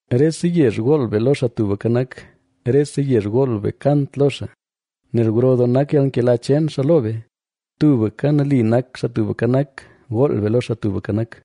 Rese yezh gool be lo Xaa Tubka Nak; rese yezh gool be kant lo xaa. Nel gro doo nak yalnkela cheen xaa lo be, tubka nali nak Xaa Tubka Nak. Gool be lo Xaa Tubka Nak.